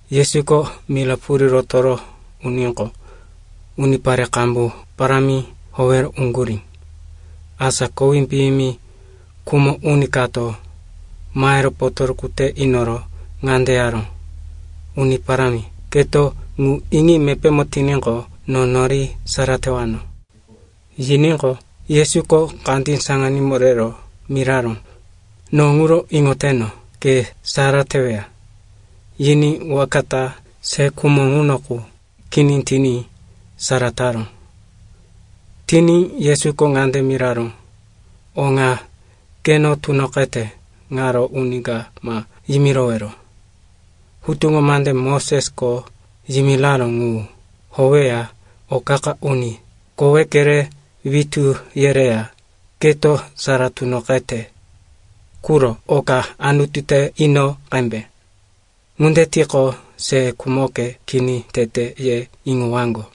Yesuko mira purí rotoro uníqo, unipare qambu parámi howero uŋgurí. Asa kowí piyimi khumo uni kato mahero potoruku te inoro ŋande yaró, “Uni Parámi, keto ŋu iŋi mepémo tiníqo, no nori sara tewano.” Yiníqo, Yesuko kandí saŋanímo rero miraró, “No ŋuro iŋoteno. Ke sara teweya.” Yiní waka ta se khumo ŋuno qu kini tiní sara taró. Tiní Yesuko ŋande miraró, “O ŋa keno tunoqete ŋaro uni ka ma yimirowero. Hutuŋo mande Mosesko yimiraró ŋu howeya o qa-qa uni koweke re witú yereya keto sara tunoqete quro oka Anutu te ino qembe. Ŋunde tiqo, se khumoke kini tete, ye iŋowaŋgo.”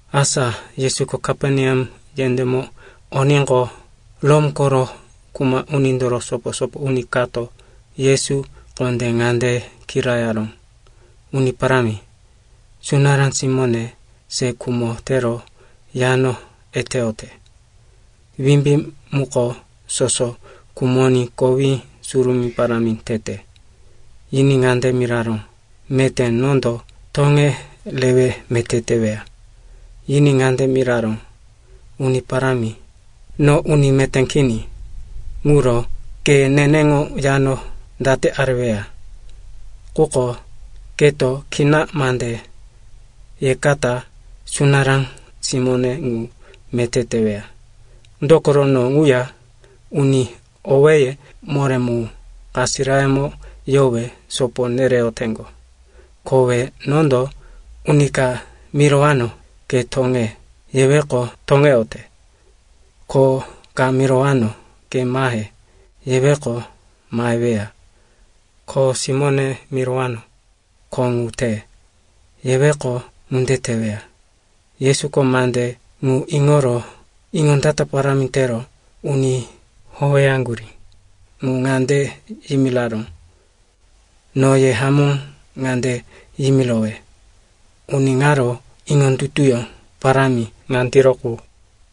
Asa Yesuko Kaperneam yendémo oníqo, Rom koro kuma unindoro sopo-sopo uni kato Yesu kondé ŋande kirayaró, “Uni Parámi, sunará simóne se khumo tero yano eteyote. Wimbí muko soso khumoní kowí surumí parámi tete.” Yiní ŋande miraró, “Meté nondo toŋe rewe meté teweya.” Yiní ŋande miraró, “Uni parámi, no uni meté kini, ŋuro ke neneŋo yano date areweya? Quko keto kina mande yekata sunará simóne ŋu meté teweya. Dokoro no ŋuya uni owéye moré mu kasirayemo yowe sopo nereyoteŋgo. Kowe nondo uni ka mirowano, ‘Ke toŋe,’ yeweqo, toŋeyote. Ko ka mirowano, ‘Ke mahe,’ yeweqo, maheweya. Kho simóne mirowano, ‘Kho ŋu te,’ yeweqo, ŋunde teweya.” Yesuko mande ŋu iŋoro iŋondata parámi tero uni howeyaŋgurí ŋu ŋande yimiraró, “No ye hamó ŋande yimirowe, uni ŋaro iŋondutuyó parámi ŋandiro qu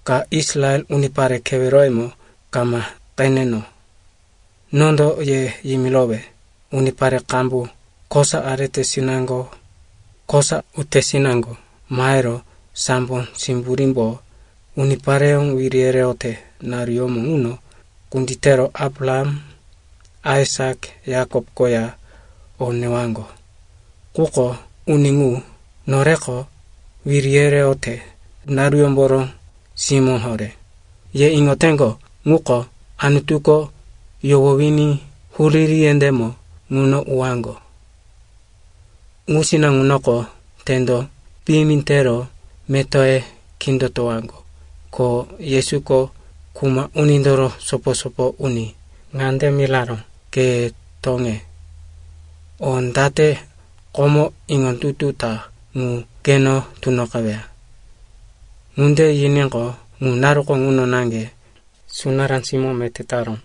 ka Israel unipare keweroyemo kama qeneno. Nondo ye yimirowe, unipare qambu kosa aretesinaŋgo kosa utesinaŋgo mahero sambo simburímbo unipareyó wiri yereyote naruyómo ŋuno kunditero Abraham, Aisak, Yakop koya o newaŋgo. Quko uni ŋu, noreko wiri yereyote naruyómboro simó horé, ye iŋoyoteŋgo ŋuko, Anutuko yohowiní huriri yendémo ŋuno uwaŋgo. Ŋusina ŋunoko tendo piyimi tero metoye kindotowaŋgo.” Ko Yesuko kuma unindoro sopo-sopo uni ŋande miraró, “Ke toŋe. O date komo iŋondutu ta ŋu keno tunoqeweya.” Ŋunde yiníqo, ŋu naruko ŋuno naŋge sunará simó meté taró.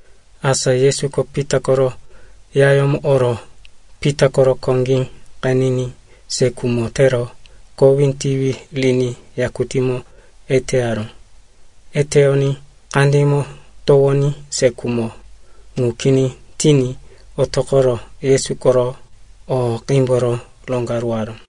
Asa Yesuko Pita koro yayómo oro Pita koro koŋgí qeniní se khumo tero kowí tiwi riní yakutímo eteyaró. Eteyoní kandímo towoní, se khumo ŋu kini tiní otoqoro Yesu koro o qímboro roŋgaruwaró.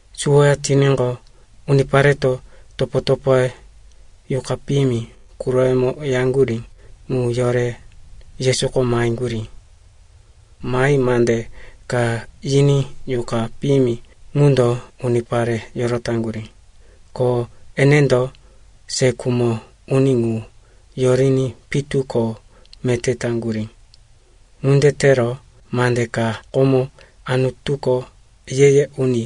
Suwoya tiníqo, unipareto topo-topoye yuqa piyimi quroyemo yaŋgurí ŋu yore Yesuko maheŋgurí. Mahi mande ka yiní yuqa piyimi ŋundo unipare yorotaŋgurí. Ko enendo se khumo uni ŋu yoriní pitu ko meté taŋgurí. Ŋunde tero mande ka komo Anutuko ye-ye uni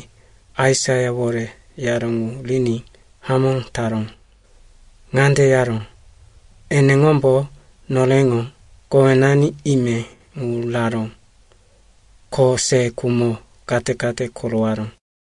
Aisaiawore yaró ŋu riní hamó taró. Ŋande yaró, “Eneŋombo noreŋo kowenani ime ŋu raró, ko se khumo kate-kate korowaró.”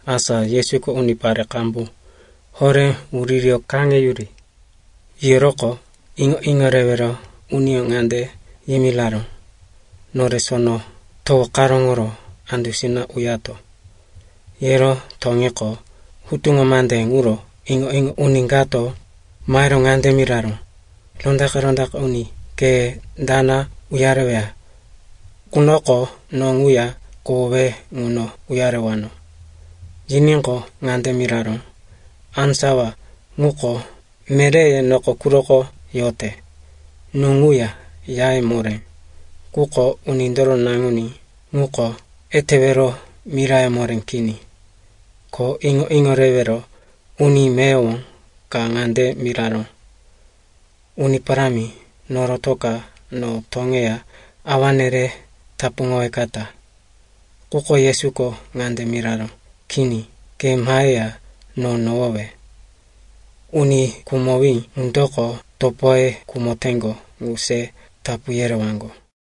Asa Yesuko unipare qambu horé wuririyo kaŋeyuri yiyoroqo, iŋo-iŋo rewero uniyó ŋande yimiraró, “Nore sono towo karóŋoro andusina uyato.” Yero toŋiqo, hutuŋo mande ŋuro iŋo-iŋo uni kato mahero ŋande miraró, “Rondaqe-rondaqe uni, ke dana uyareweya qunoko no ŋuya kohowe ŋuno uyarewano.” Yiníqo, ŋande miraró, “Á sawa ŋuko meréye noko quroko yote, nú ŋuya yaye moré. Quko Unindoro Naŋuní ŋuko etewero mirayó moré kini.” Ko iŋo-iŋo rewero uni meyowo ka ŋande miraró, “Uni Parámi, norotoka no toŋeya awane re tapuŋowekata.” Quko Yesuko ŋande miraró, “Kini, ke maheya no nohowe. Uni khumowí ŋundoko topoye khumoteŋgo ŋu se tapu yerewaŋgo.”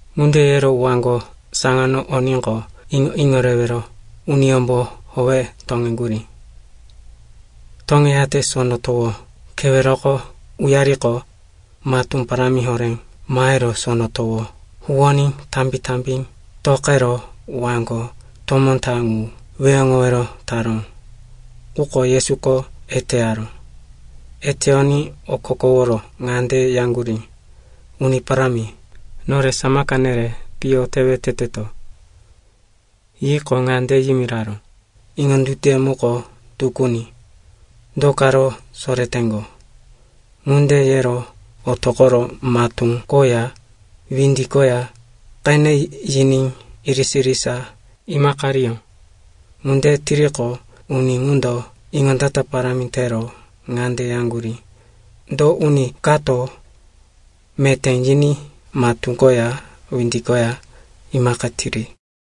Ŋunde yero waŋgo saŋano oníqo, iŋo-iŋo rewero uniyómbo howe toŋeŋgurí. Toŋeyate sono towo keweroko uyariqo, matú parámi horé mahero sono towo huwoní tambi-tambi toqero waŋgo tomó ta ŋu weheŋowero taró. Quko Yesuko eteyaró. Eteyoní okokoworo ŋande yaŋgurí, “Uni Parámi, nore samaka nere, piyo tewe teteto.” Yiqo, ŋande yimiraró, “Iŋondutuye muko tukuni. Do karo soreteŋgo?” Ŋunde yero otoqoro matú koya windi koya qene yiní irisa-irisa imaqariyó. Ŋunde tiriqo, uni ŋundo iŋondata parámi tero ŋande yaŋgurí, “Do uni kato meté yiní matú koya windi koya imaqitiri?”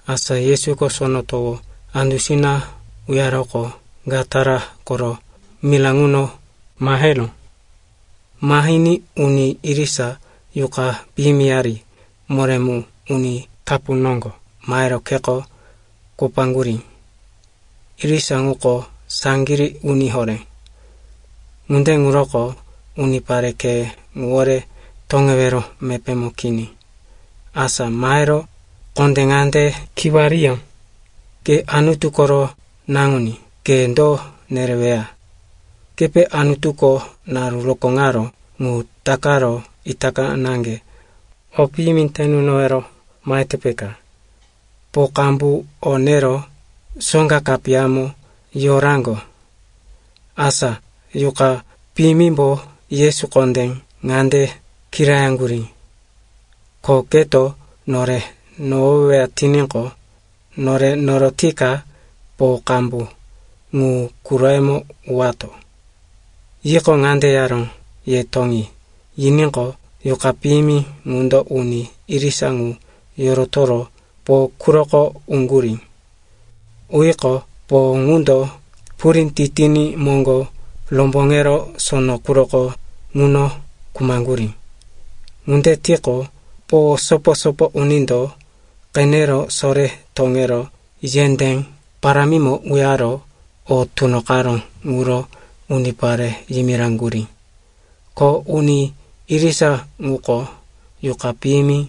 Asa Yesuko sono towo andusina uyaroqo, Gatara koro mira ŋuno maheró. Mahiní uni irisa yuqa piyimiyari moré mu uni tapu noŋgo mahero kheko kopaŋgurí. Irisa ŋuko saŋgirí uni horé, ŋunde ŋuroko unipare khe ŋuwore toŋewero mepémo kini. Asa mahero kondé ŋande kiwariyó, “Ke Anutu koro Naŋuní, ke do nereweya? Kepe Anutuko naru rokóŋaró ŋu takaro itaka naŋge o piyimi te nunowero mahete, peka?” Po qambu o nero soŋga kapiyamo yoraŋgo. Asa yuqa piyimimbo Yesu kondé ŋande kirayaŋgurí, “Ko keto nore nohoweweya tiníqo, nore norotika po qambu ŋu quroyemo uwato.” Yiqo, ŋande yaró, “Ye toŋi,” yiníqo, yuqa piyimi ŋundo uni irisa ŋu yorotoro po quroko uŋgurí. Uyiqo, po ŋundo purí titiní moŋgo romboŋero sono quroko ŋuno khumaŋgurí. Ŋunde tiqo, po sopo-sopo unindo qenero sore toŋero yendé parámimo uyaro o tunoqaró ŋuro unipare yimiraŋgurí. Ko uni irisa ŋuko yuqa piyimi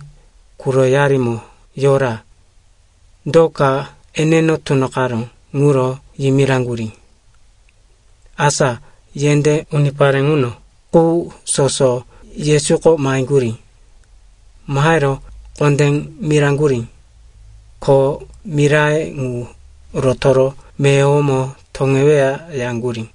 quroyarimo yora, do ka eneno tunoqaró ŋuro yimiraŋgurí. Asa yendé unipare ŋuno qu soso Yesuko maheŋgurí. Mahero kondé miraŋgurí, ko miraye ŋu rotoro meyowomo toŋeweya, yaŋgurí.